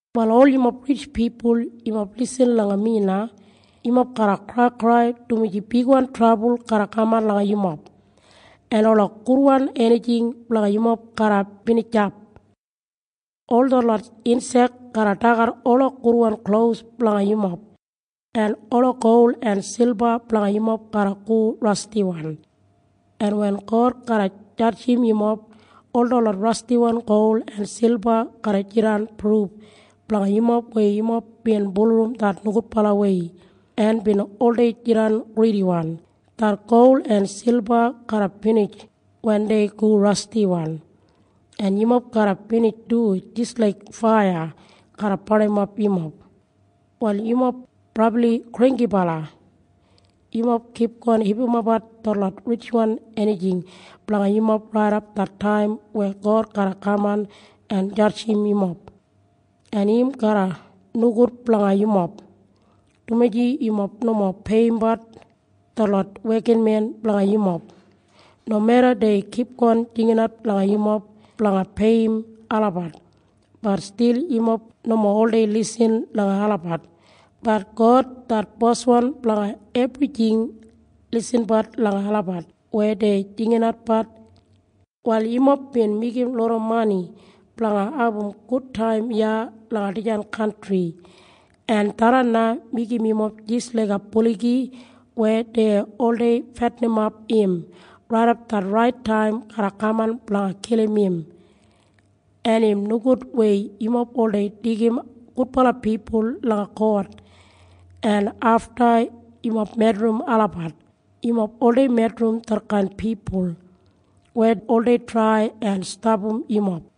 Wal ol yumob ritj pipul, yumob lisin langa mi na. Yumob garra kraikrai, dumaji bigwan trabul garra kaman langa yumob, en ola gudwan enijing blanga yumob garra binijap. Ol detlot insek garra dagat ola gudwan klos blanga yumob, en ola gol en silba blanga yumob garra go rastiwan. En wen God garra jadjim yumob, ol detlot rastiwan gol en silba garra jidan pruf blanga yumob weya yumob bin bulurrum det nogudbalawei en bin oldei jidan gridiwan. Det gol en silba garra binij wen dei go rastiwan, en yumob garra binij du jis laik faiya garra barnimap yumob. Wal yumob brabli granggibala. Yumob kipgon hipimapbat detlot ritjwan enijing blanga yumob raidap det taim wen God garra kaman en jadjim yumob, en im garra nogud blanga yumob, dumaji yumob nomo peiyimbat detlot wekinmen blanga yumob. Nomeda dei kipgon jinginat langa yumob blanga peiyim olabat, bat stil yumob nomo oldei lisin langa olabat. Bat God det Boswan blanga ebrijing lisinbat langa olabat weya dei jinginatbat. Wal yumob bin meigim loda mani blanga abum gudtaim iya langa dijan kantri. En tharran na meigim yumob jis laiga buligi weya dei oldei fetinimap im raidap det rait taim garra kaman blanga kilim im. En im nogud weya yumob oldei deigim gudbala pipul langa kot, en afta yumob medrim olabat. Yumob oldei medrim detkain pipul weya oldei trai en stapam yumob.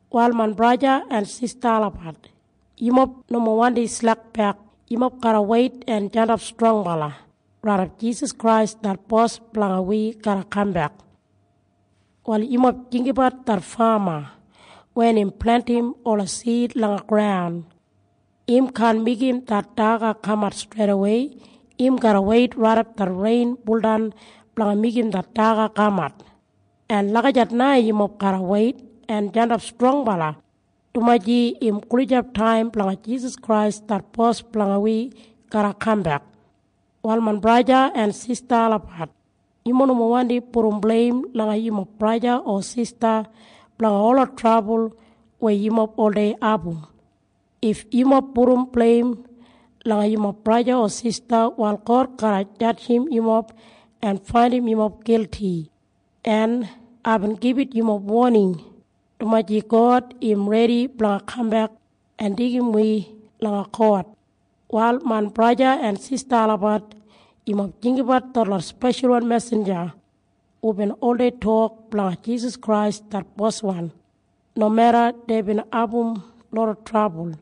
Wal main braja en sista olabat, yumob nomo wandim slekbek. Yumob garra weit en jandap strongbala raidap Jisas Krais det Bos blanga wi garra kambek. Wal yumob jinggabat det fama. Wen im plentim ola sid langa graun, im kaan meigim det daga kamat streidawei. Im garra weit raidap det rein buldan blanga meigim det daga kamat. En lagijat na yumob garra weit en jandap strongbala, dumaji im gulijap taim blanga Jisas Krais det Bos blanga wi garra kambek. Wal main braja en sista olabat, yumob nomo wandi pudum bleim langa yumob braja o sista blanga ola trabul weya yumob oldei abum. If yumob pudum bleim langa yumob braja o sista, wal God garra jadjim yumob en faindim yumob gilti. En aibin gibit yumob woning, dumaji God im redi blanga kambek en deigim wi langa kot. Wal main braja en sista olabat, yumob jinggabat detlot speshalwan mesinja hubin oldei tok blanga Jisas Krais det Boswan. Nomeda deibin abum loda trabul,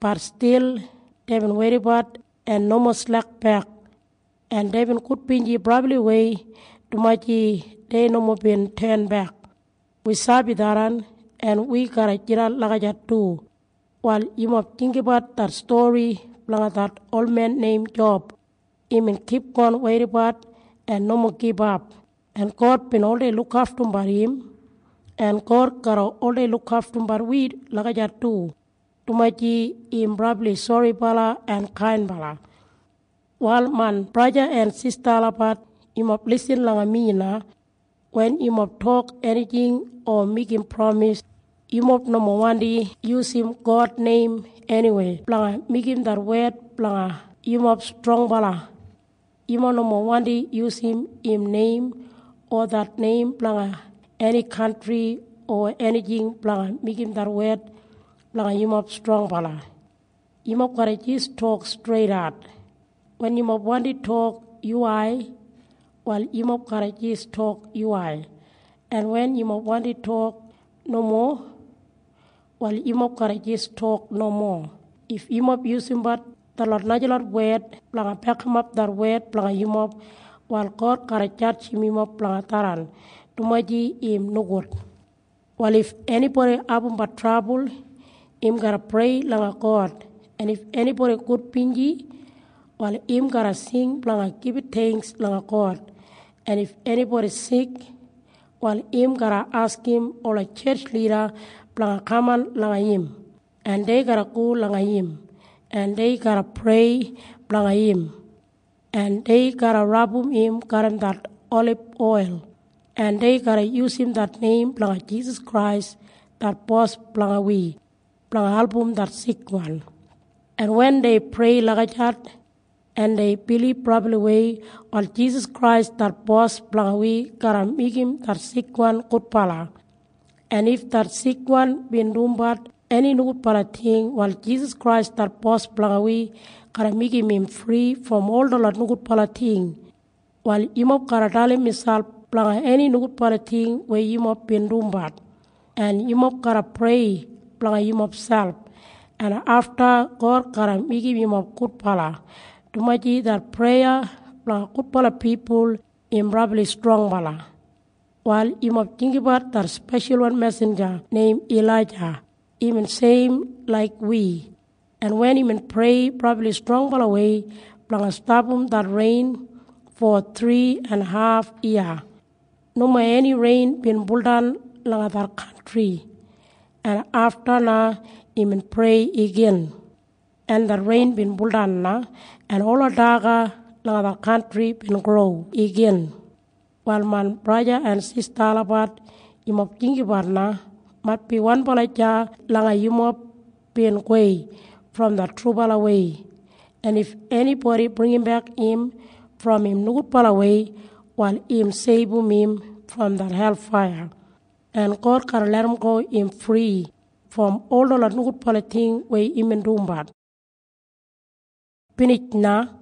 bat stil deibin weidabat en nomo slekbek, en deibin gudbinji brabliwei, dumaji dei nomo bin tenbek. Wi sabi tharran, en wi garra jidan lagijat du. Wal yumob jinggabat det stori blanga det olmen neim Job. Imbin kipgon weidabat en nomo gibap, en God bin oldei lukaftumbat im. En God garra oldei lukaftumbat wi lagijat du, dumaji im brabli soribala en kainbala. Wal main braja en sista olabat, yumob lisin langa mi na. Wen yumob tok enijing o meigim pramis, yumob nomo wandi yusum God neim eniwei blanga meigim det wed blanga yumob strongbala. Yumob nomo wandi yusum im neim o det neim blanga eni kantri o enijing blanga meigim det wed blanga yumob strongbala. Yumob garra jis tok streidat. Wen yumob wandi tok yuwai, wal yumob garra jis tok yuwai. En wen yumob wandi tok nomo, wal yumob garra jis tok nomo. If yumob yusumbat detlot najalot wed blanga bekimap det wed blanga yumob, wal God garra jadjim yumob blanga tharran, dumaji im nogud. Wal if enibodi abumbat trabul, im garra prei langa God. En if enibodi gudbinji, wal im garra sing blanga gibit theingks langa God. En if enibodi sik, wal im garra askim ola tjetj lida blanga kaman langa im, en dei garra go langa im, en dei garra prei blanga im, en dei garra rabum im garram det oliboil, en dei garra yusum det neim blanga Jisas Krais det Bos blanga wi blanga album det sikwan. En wen dei prei lagijat en dei bilib brabliwei, wal Jisas Krais det Bos blanga wi garra meigim det sikwan gudbala. En if det sikwan bin dumbat eni nogudbala ting, wal Jisas Krais det Bos blanga wi garra meigim im fri brom ol detlot nogudbala ting. Wal yumob garra dalim miselp blanga eni nogudbala ting weya yumob bin dumbat, en yumob garra prei blanga yumob selp, en afta God garra meigim yumob gudbala, dumaji det preya blanga gudbala pipul im brabli strongbala. Wal yumob jinggabat det speshalwan mesinja neim Ilaija. Imbin seim laik wi, en wen imbin prei brabli strongbalawei blanga stapam det rein, fo thri en haf yiya nomo eni rein bin buldan langa det kantri. En afta na imbin prei igin, en det rein bin buldan na, en ola daga langa det kantri bin gro igin. Wal main braja en sista olabat, yumob jinggabat na. Maitbi wanbala deya langa yumob bin gowei brom det trubalawei. En if enibodi bringimbek im brom im nogudbalawei, wal im seibum im brom det helfaiya, en God garra larramgo im fri brom ol detlot nogudbala ting weya imbin dumbat. Binij na.